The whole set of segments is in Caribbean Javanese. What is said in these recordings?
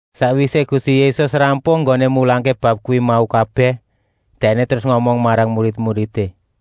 Sakwisé Gusti Yésus rampung enggoné mulangké bab kuwi mau kabèh, Dèkné terus ngomong marang murid-muridé: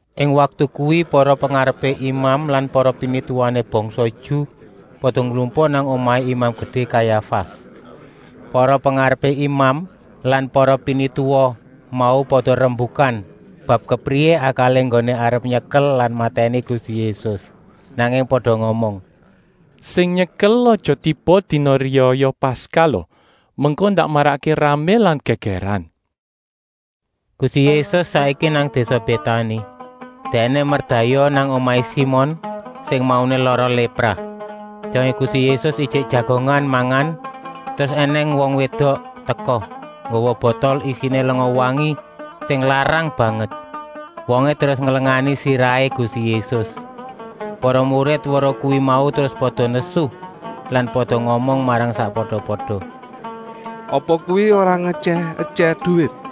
Ing waktu kuwi para pengarepé imam lan para pinituwané bangsa Ju pada nglumpuk nang omahé Imam Gedé Kayafas. Para pengarepé imam lan para pinituwa mau pada rembukan bab kepriyé akalé enggoné arep nyekel lan matèni Gusti Yésus. Nanging pada ngomong: “Sing nyekel aja tiba dina riyaya Paskah lo, mengko ndak marakké ramé lan gègèran.” Gusti Yésus saiki nang désa Bétani. Dèkné merdayoh nang omahé Simon sing mauné lara lépra. Dongé Gusti Yésus ijik jagongan mangan, terus ènèng wong wédok teka, nggawa botol isiné lenga wangi sing larang banget. Wongé terus nglengani sirahé Gusti Yésus. Para murid weruh kuwi mau terus pada nesu lan pada ngomong marang sakpada-pada: “Apa kuwi ora ngetyèh-etyèh duwit?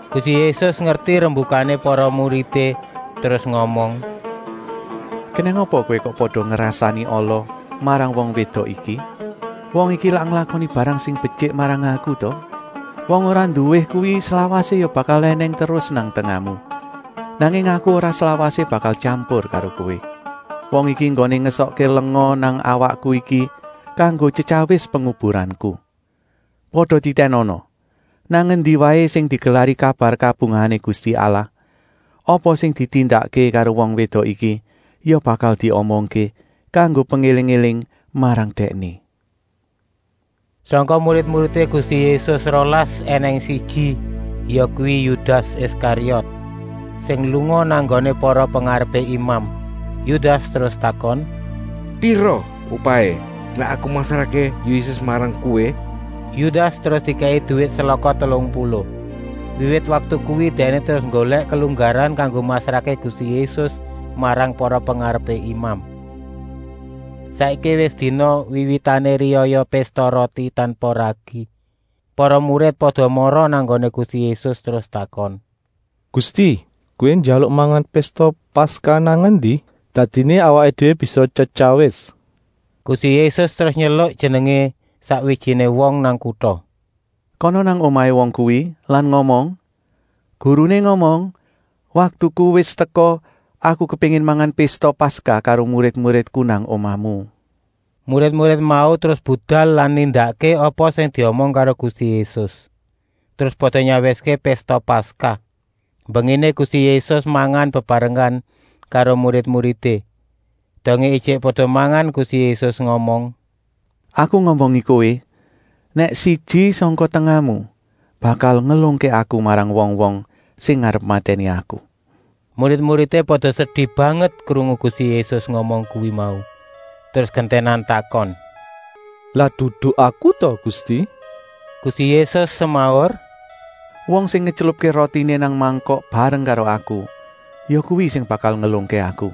Gusti Yésus ngerti rembukané para muridé terus ngomong: “Kenèng apa kowé kok pada ngrasani ala marang wong wédok iki. Wong iki lak nglakoni barang sing betyik marang Aku ta? Wong ora nduwé kuwi slawasé ya bakal ènèng terus nang tengahmu, nanging Aku ora slawasé bakal tyampur karo kowé. Wong iki enggoné ngesokké lenga nang awakku iki kanggo tyetyawis penguburanku. Pada titènana! Nang endi waé sing digelari kabar kabungahané Gusti Allah, apa sing ditindakké karo wong wédok iki ya bakal diomongké, kanggo pengéling-éling marang dèkné.” Sangka murid-muridé Gusti Yésus rolas ènèng siji, yakuwi Yudas Iskariot, sing lunga nang nggoné para pengarepé imam. Yudas terus takon: “Pira upahé nèk aku masrahké Yésus marang kowé?” Yudas terus dikèki duwit selaka telung puluh. Wiwit waktu kuwi dèkné terus nggolèk kelunggaran kanggo masrahké Gusti Yésus marang para pengarepé imam. Saiki wis dina wiwitané Riyaya Pésta Roti Tanpa Ragi. Para murid pada mara nang nggoné Gusti Yésus terus takon: “Gusti, Kowé njaluk mangan Pésta Paskah nang endi? Dadiné awaké déwé bisa tyetyawis.” Gusti Yésus terus nyeluk jenengé sakwijiné wong nang kuta: “Kana nang omahé wong kuwi lan ngomong: ‘Guruné ngomong: waktuku wis teka, Aku kepéngin mangan Pésta Paskah karo murid-muridku nang omahmu.’” Murid-murid mau terus budal lan nindakké apa sing diomong karo Gusti Yésus, terus pada nyawiské Pésta Paskah. Mbenginé Gusti Yésus mangan bebarengan karo murid-muridé. Dongé ijik pada mangan, Gusti Yésus ngomong: “Aku ngomongi kowé nèk siji sangka tengahmu bakal ngelungké Aku marang wong-wong sing arep matèni Aku.” Murid-muridé pada sedi banget krungu Gusti Yésus ngomong kuwi mau, terus gentènan takon: “Lak dudu aku ta Gusti?” Gusti Yésus semaur: “Wong sing ngetylupké rotiné nang mangkok bareng karo Aku, yakuwi sing bakal ngelungké Aku.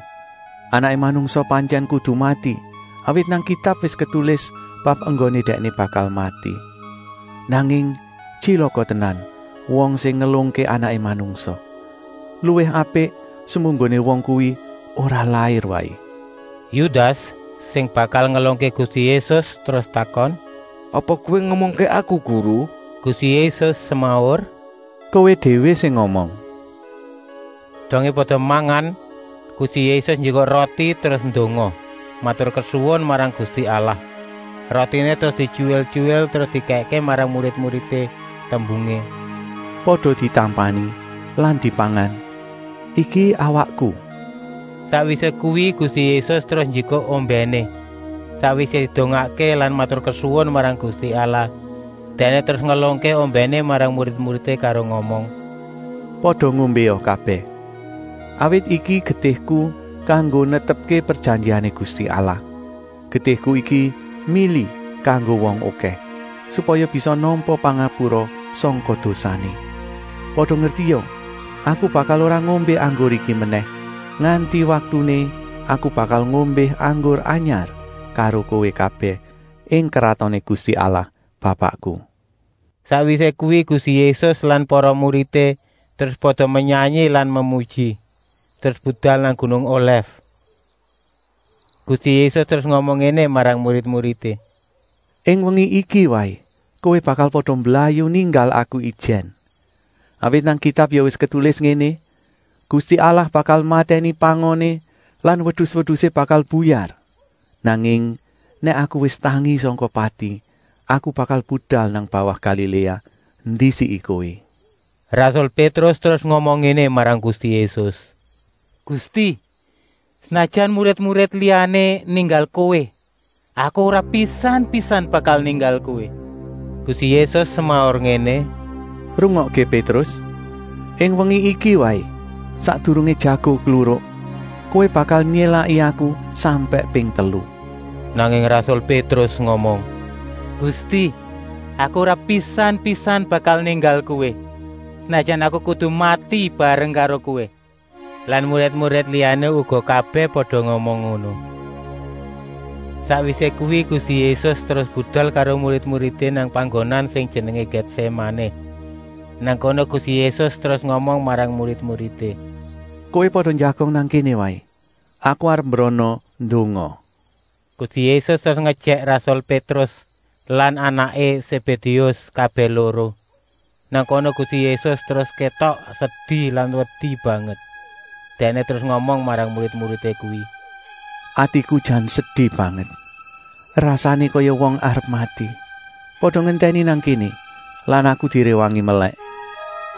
Anaké Manungsa pantyèn kudu mati, awit nang Kitab wis ketulis bab enggoné Dèkné bakal mati. Nanging tyilaka tenan wong sing ngelungké Anaké Manungsa. Luwih apik semunggoné wong kuwi ora lair waé.” Yudas, sing bakal ngelungké Gusti Yésus, terus takon: “Apa Kowé ngomongké aku Guru?” Gusti Yésus semaur: “Kowé déwé sing ngomong.” Dongé pada mangan, Gusti Yésus njikuk roti terus ndonga, maturkesuwun marang Gusti Allah. Rotiné terus dityuwil-tyuwil terus dikèkké marang murid-muridé, tembungé: “Pada ditampani lan dipangan, iki awakku.” Sakwisé kuwi Gusti Yésus terus njikuk ombèné. Sakwisé didongakké lan maturkesuwun marang Gusti Allah, Dèkné terus ngelungké ombèné marang murid-muridé karo ngomong: “Pada ngombéa kabèh. Awit iki getihku kanggo netepké prejanjiané Gusti Allah. Getihku iki mili kanggo wong okèh, supaya bisa nampa pangapura sangka dosané. Pada ngertia, Aku bakal ora ngombé anggur iki menèh nganti waktuné Aku bakal ngombé anggur anyar karo kowé kabèh ing Kratoné Gusti Allah Bapakku.” Sakwisé kuwi Gusti Yésus lan para muridé terus pada menyanyi lan memuji, terus budal nang gunung Olèf. Gusti Yésus terus ngomong ngéné marang murid-muridé: “Ing wengi iki waé kowé bakal pada mblayu ninggal Aku ijèn. Awit nang Kitab ya wis ketulis ngéné: ‘Gusti Allah bakal matèni pangoné lan wedus-wedusé bakal buyar.’ Nanging nèk Aku wis tangi sangka pati, Aku bakal budal nang bawah Galiléa, ndisiki kowé.” Rasul Pétrus terus ngomong ngéné marang Gusti Yésus: “Gusti, senajan murid-murid liyané ninggal Kowé, aku ora pisan-pisan bakal ninggal Kowé!” Gusti Yésus semaur ngéné: “Rungokké Pétrus, ing wengi iki waé, sakdurungé jago kluruk, kowé bakal nyélaki Aku sampèk ping telu.” Nanging rasul Pétrus ngomong: “Gusti, Aku ora pisan-pisan bakal ninggal Kowé, senajan aku kudu mati bareng karo Kowé.” Lan murid-murid liyané uga kabèh pada ngomong ngono. Sakwisé kuwi Gusti Yésus terus budal karo murid-muridé nang panggonan sing jenengé Gètsémané. Nang kono Gusti Yésus terus ngomong marang murid-muridé: “Kowé pada njagong nang kéné waé. Aku arep mbrana ndonga.” Gusti Yésus terus ngejèk rasul Pétrus lan anaké Sébédéus kabèh loro. Nang kono Gusti Yésus terus kétok sedi lan wedi banget. Dèkné terus ngomong marang murid-murid kuwi: “Atiku jan sedi banget, rasané kaya wong arep mati. Pada ngentèni nang kéné lan Aku diréwangi melèk.”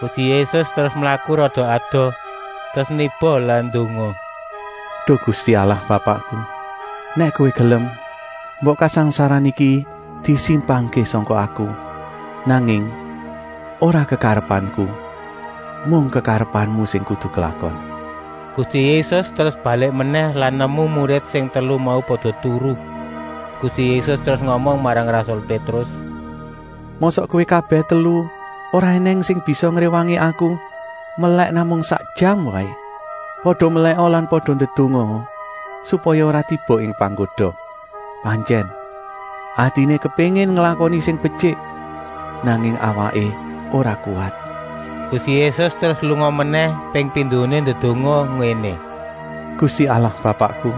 Gusti Yésus terus mlaku rada adoh, terus niba lan ndonga: “Duh Gusti Allah Bapakku, nèk Kowé gelem, mbok kasangsaran iki disimpangké sangka Aku. Nanging ora kekarepanku, mung kekarepanmu sing kudu klakon.” Gusti Yésus terus balik menèh lan nemu murid sing telu mau pada turu. Gusti Yésus terus ngomong marang rasul Pétrus: “Mosok kowé kabèh telu ora ènèng sing bisa ngréwangi Aku melèk namung sak jam waé? Pada melèka lan pada ndedongaa, supaya ora tiba ing panggoda. Pantyèn, atiné kepéngin nglakoni sing betyik, nanging awaké ora kuwat.” Gusti Yésus terus lunga menèh ping pindoné ndedonga ngéné: “Gusti Allah Bapakku,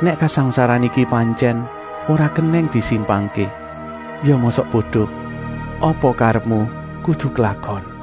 nèk kasangsaran iki pantyèn ora kenèng disimpangké, ya mosok bodo, apa karepmu kudu klakon.”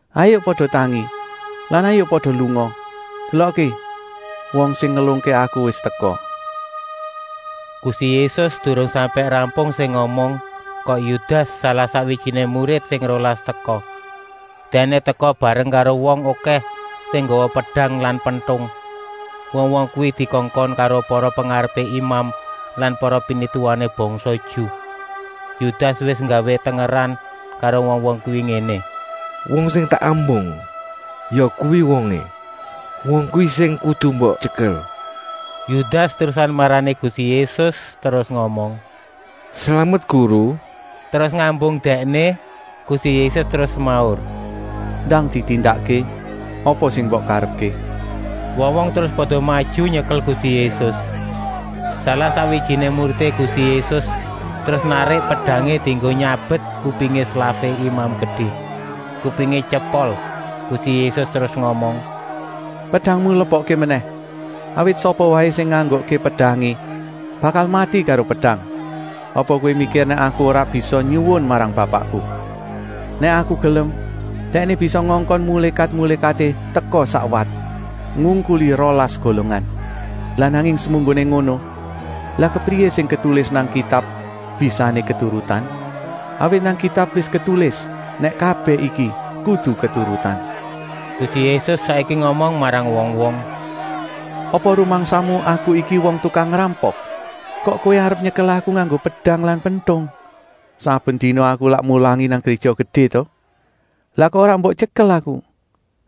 Hayuk pada tangi lan hayuk pada lunga. Delokké, wong sing ngelungké Aku wis teka.” Gusti Yésus durung sampèk rampung sing ngomong, kok Yudas, salah-sakwijiné murid sing rolas, teka. Dèkné teka bareng karo wong okèh sing nggawa pedang lan pentung. Wong-wong kuwi dikongkon karo para pengarepé imam lan para pinituwané bangsa Ju. Yudas wis nggawé tengeran karo wong-wong kuwi ngéné: “Wong sing tak ambung, yakuwi wongé. Wong kuwi sing kudu mbok tyekel.” Yudas terusan marani Gusti Yésus terus ngomong: “Slamet Guru,” terus ngambung Dèkné. Gusti Yésus terus semaur: “Ndang ditindakké apa sing mbok karepké!” Wong-wong terus pada maju nyekel Gusti Yésus. Salah-sakwijiné muridé Gusti Yésus terus narik pedangé dienggo nyabet kupingé slafé Imam Gedé. Kupingé tyepol. Gusti Yésus terus ngomong: “Pedangmu lebokké menèh! Awit sapa waé sing nganggokké pedangé, bakal mati karo pedang. Apa kowé mikir nèk Aku ora bisa nyuwun marang Bapakku. Nèk Aku gelem, Dèkné bisa ngongkon mulékat-mulékaté teka sakwat, ngungkuli rolas golongan. Lah nanging semunggoné ngono, lah kepriyé sing ketulis nang Kitab bisané keturutan? Awit nang Kitab wis ketulis nèk kabèh iki kudu keturutan.” Gusti Yésus saiki ngomong marang wong-wong: “Apa rumangsamu Aku iki wong tukang ngrampok, kok kowé arep nyekel Aku nganggo pedang lan pentung? Saben dina Aku lak mulangi nang Gréja Gedé ta? Lah kok ora mbok tyekel Aku?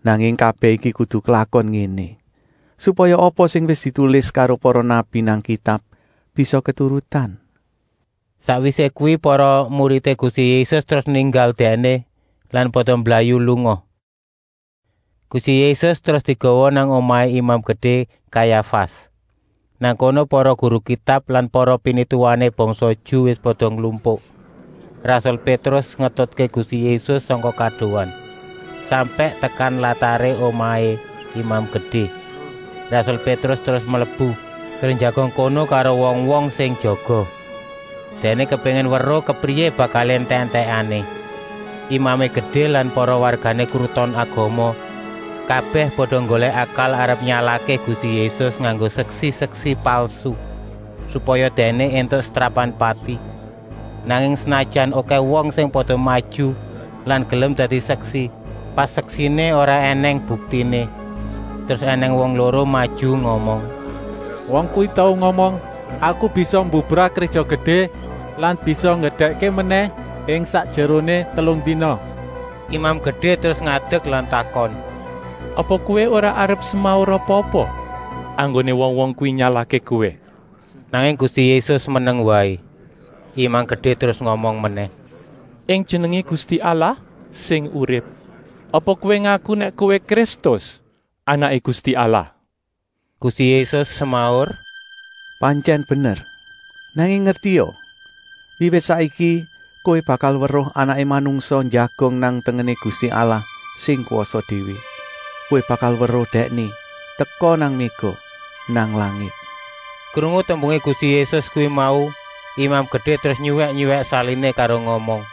Nanging kabèh iki kudu klakon ngéné, supaya apa sing wis ditulis karo para nabi nang Kitab bisa keturutan.” Sakwisé kuwi para muridé Gusti Yésus terus ninggal Dèkné lan pada mblayu lunga. Gusti Yésus terus digawa nang omahé Imam Gedé Kayafas. Nang kono para guru Kitab lan para pinituwané bangsa Ju wis pada nglumpuk. Rasul Pétrus ngetutké Gusti Yésus sangka kadohan, sampèk tekan lataré omahé Imam Gedé. Rasul Pétrus terus mlebu, terus njagong kono karo wong-wong sing jaga. Dèkné kepéngin weruh kepriyé bakalé entèk-entèkané. Imamé Gedé lan para wargané Kruton Agama kabèh pada nggolèk akal arep nyalahké Gusti Yésus nganggo seksi-seksi palsu, supaya Dèkné éntuk setrapan pati. Nanging senajan okèh wong sing pada maju lan gelem dadi seksi, paseksiné ora ènèng buktiné. Terus ènèng wong loro maju ngomong: “Wong kuwi tau ngomong: ‘Aku bisa mbubrah Gréja Gedé lan bisa ngedekké menèh ing sakjeroné telung dina.’” Imam Gedé terus ngadek lan takon: “Apa Kowé ora arep semaur apa-apa enggoné wong-wong kuwi nyalahké Kowé?” Nanging Gusti Yésus meneng waé. Imam Gedé terus ngomong menèh: “Ing jenengé Gusti Allah sing urip, apa Kowé ngaku nèk Kowé Kristus, Anaké Gusti Allah?” Gusti Yésus semaur: “Pantyèn bener. Nanging ngertia, wiwit saiki kowé bakal weruh Anaké Manungsa njagong nang tengené Gusti Allah sing kwasa déwé. Kowé bakal weruh Dèkné teka nang méga nang langit.” Krungu tembungé Gusti Yésus kuwi mau, Imam Gedé terus nyuwèk-nyuwèk saliné karo ngomong: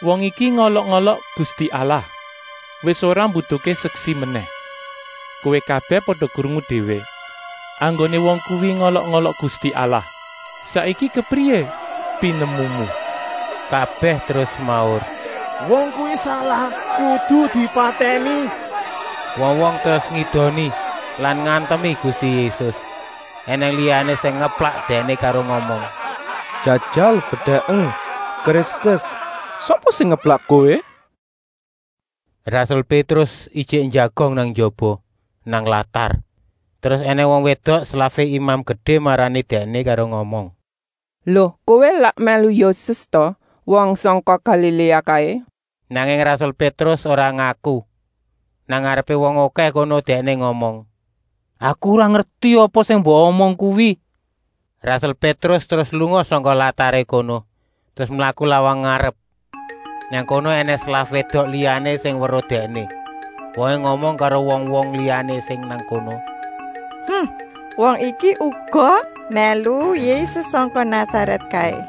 “Wong iki ngolok-olok Gusti Allah! Wis ora mbutuhké seksi menèh! Kowé kabèh pada krungu déwé enggoné wong kuwi ngolok-olok Gusti Allah. Saiki kepriyé pinemumu?” Kabèh terus semaur: “Wong kuwi salah, kudu dipatèni!” Wong-wong terus ngidoni lan ngantemi Gusti Yésus. Enèng liyané sing ngeplak Dèkné karo ngomong: “Jajal bedèken, Kristus, sapa sing ngeplak Kowé?” Rasul Pétrus ijik njagong nang njaba, nang latar. Terus ènèng wong wédok slafé Imam Gedé marani dèkné karo ngomong: “Lo, kowé lak mèlu Yésus ta, wong sangka Galiléa kaé?” Nanging rasul Pétrus ora ngaku. Nang ngarepé wong okèh kono dèkné ngomong: “Aku ora ngerti apa sing mbok omong kuwi.” Rasul Pétrus terus lunga sangka lataré kono terus mlaku lawang ngarep. Nang kono ènèng slaf wédok liyané sing weruh dèkné. Wongé ngomong karo wong-wong liyané sing nang kono: “Wong iki uga mèlu Yésus sangka Nasarèt kaé!”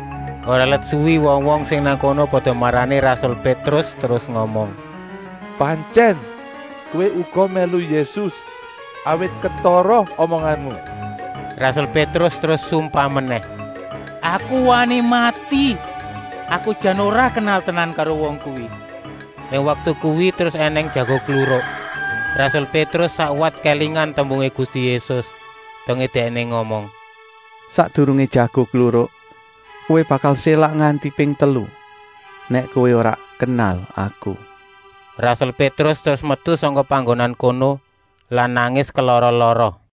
Ora let suwi wong-wong sing nang kono pada marani rasul Pétrus terus ngomong: “Pantyèn, kowé uga mèlu Yésus, awit ketara omonganmu!” Rasul Pétrus terus sumpah menèh: “Aku wani mati, aku jan ora kenal tenan karo wong kuwi.” Ing waktu kuwi terus ènèng jago kluruk. Rasul Pétrus sakwat kélingan tembungé Gusti Yésus, dongé Dèkné ngomong: “Sakdurungé jago kluruk, kowé bakal sélak nganti ping telu, nèk kowé ora kenal Aku.” Rasul Pétrus terus metu sangka panggonan kono lan nangis kelara-lara.